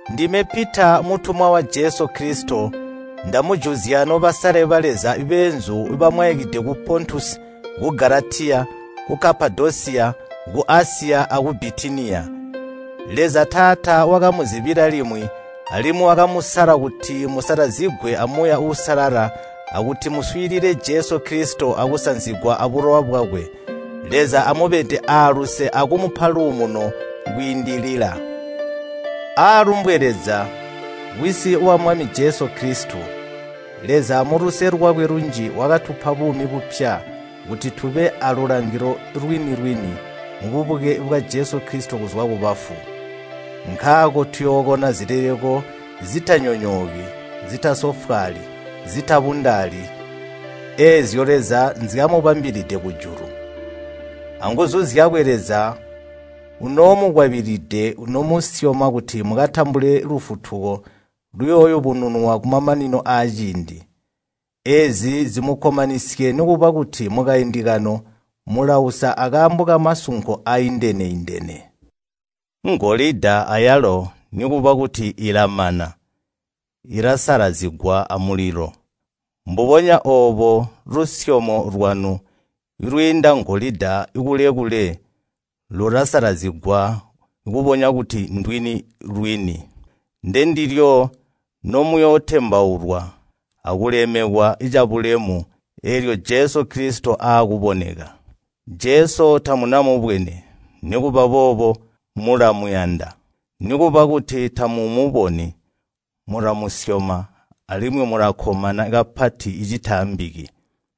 Ndime Pita mutumwa wa Jesu Kilisito, ndamujuzya nobasale ba Leza beenzu bamwaikide ku Pontusi, ku Galatiya, ku Kapadosiya, ku Asiya, aku Bitiniya. Leza Taata wakamuzibila limwi alimwi wakamusala kuti musalazigwe a Muuya Uusalala akuti muswiilile Jesu Kilisito akusanzigwa abulowa bwakwe. Leza amubede aaluse akumupa luumuno kwiindilila. Aalumbwe Leza, Wisi wa Mwami Jesu Kilisito! Leza muluse lwakwe lunji wakatupa buumi bupya kuti tube aalulangilo lwini-lwini mububuke bwa Jesu Kilisito kuzwa kubafu. Nkaako tuyookona zileleko zitanyonyooki, zitasofwaali, zitabundaali eezyo Leza nzyamubambilide kujulu. Anguzu zyakwe Leza unoomukwabilide nomusyoma kuti mukatambule lufutuko luyooyubununwa kumamanino aaciindi. Eezi zimukkomanisye nikuba kuti mukaindi kano mulausa akaambo kamasunko aaindene-indene. Ngolida ayalo nikuba kuti ilamana ilasalazigwa amulilo. Mbubonya oobo lusyomo lwanu lwiinda ngolida kule-kule lulasalazigwa kubonya kuti ndwini-lwini. Ndendilyo nomuyootembaulwa akulemekwa cabulemu eelyo Jesu Kilisito aakuboneka. Jesu tamunamubwene, nikuba boobo mulamuyanda. Nikuba kuti tamumuboni, mulamusyoma alimwi mulakkomana kapati citaambiki.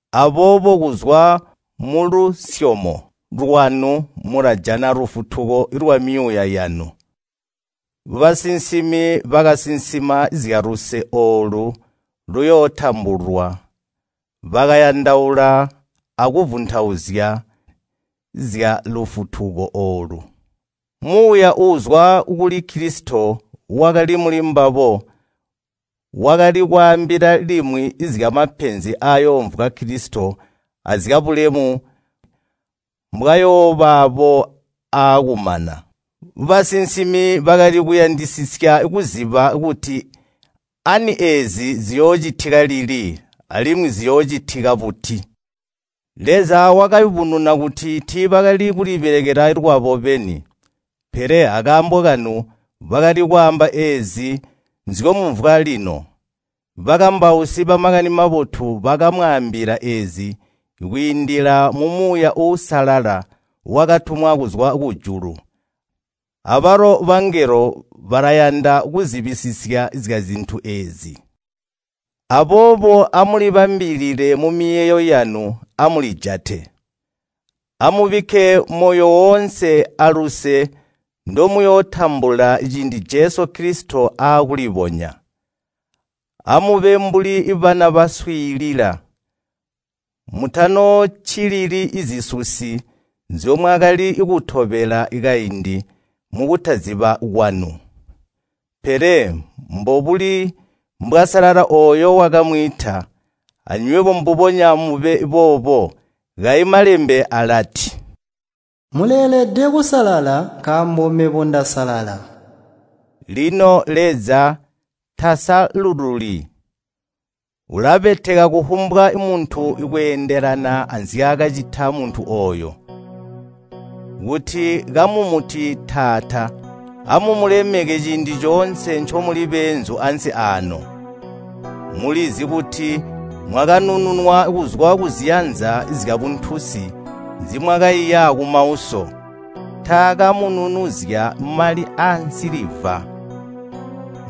Aboobo kuzwa mulusyomo lwanu mulajana lufutuko lwamyuuya yanu. Basinsimi bakasinsima zyaluse oolu luyootambulwa, bakayandaula akuvuntauzya zyalufutuko oolu. Muuya uuzwa kuli Kilisito wakali mulimbabo wakali kwaambila limwi zyamapenzi aayoomvwa Kilisito azyabulemu mbwayoobaabo aakumana. Basinsimi bakali kuyandisisya kuziba kuti ani eezi ziyoocitika lili alimwi ziyoocitika buti? Leza wakayubununa kuti tiibaali kulibelekela lwabo beni, pele akaambo kanu bakali kwaamba eezi nzyomumvwa lino. Bakambausi ba Makani Mabotu bakamwaambila eezi kwiindila mu Muuya Uusalala wakatumwa kuzwa kujulu. Abalo bangelo balayanda kuzibisisya zyazintu eezi. Aboobo amulibambilile mumiyeeyo yanu, amulijate. Amubikke moyo woonse aluse ndomuyootambula ciindi Jesu Kilisito aakulibonya. Amube mbuli bana baswiilila. Mutanooccilili zisusi nzyomwakali kutobela kaindi mukutaziba kwanu. Pele mbubuli mbwasalala ooyo wakamwiita, anywebo mbubonya mube boobo. Kayi Malembe alati, “Muleelede kusalala, nkaambo mebo ndasalala.” Lino Leza tasalululi. Ulabeteka kufumbwa muntu kweendelana anzyaakacita muntu ooyo. Kuti kamumuti Taata amumulemeke ciindi coonse ncomuli beenzu ansi aano. Mulizi kuti mwakanununwa kuzwa kuziyanza zyabuntunsi nzimwakaiya kumauso. Taakamununuzya mali aansiliva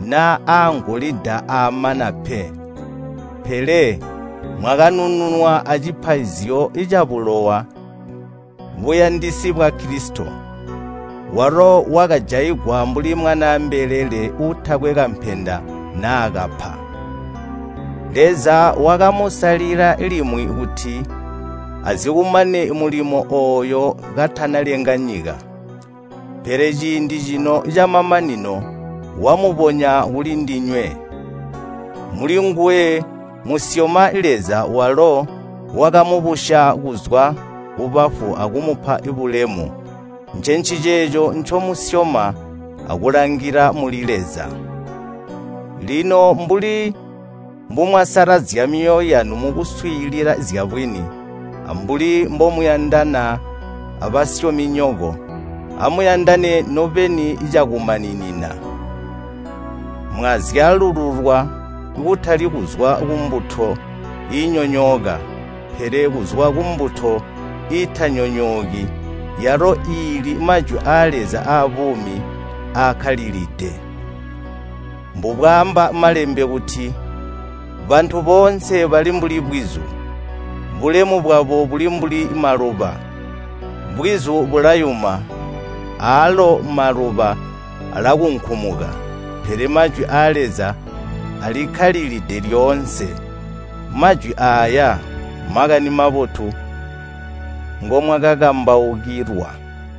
naa aangolida aamana pe, pele mwakanununwa acipaizyo cabulowa buyandisi bwa Kilisito, walo wakajaigwa mbuli mwanaa mbelele uutakwe kampenda naa kapa. Leza wakamusalila limwi kuti azikumane mulimo ooyu katanalenga nyika. Pele ciindi cino camamanino wamubonya kulindinywe. Mulinguwe musyoma Leza walo wakamubusya kuzwa kubafu akumupa bulemu. Ncenciceeco ncomusyoma akulangila muli Leza. Lino mbuli mbumwasalazya myoyo yanu mukuswiilila zyabwini, ambuli mbomuyandana abasyominyoko, amuyandane nobeni cakumaninina. Mwazyalululwa, kutali kuzwa kumbuto iinyonyooka, pele kuzwa kumbuto iitanyonyooki yalo iili Majwi aa Leza aabuumi aakkalilide. Mbubwaamba Malembe kuti, “Bantu boonse bali mbuli bwizu, bulemu bwabo buli mbuli maluba. Bwizu bulayuma, aalo maluba alakunkumuka, pele Majwi aa Leza alikkalilide lyoonse.” Majwi aaya Makani Mabotu ngomwakakambaukilwa.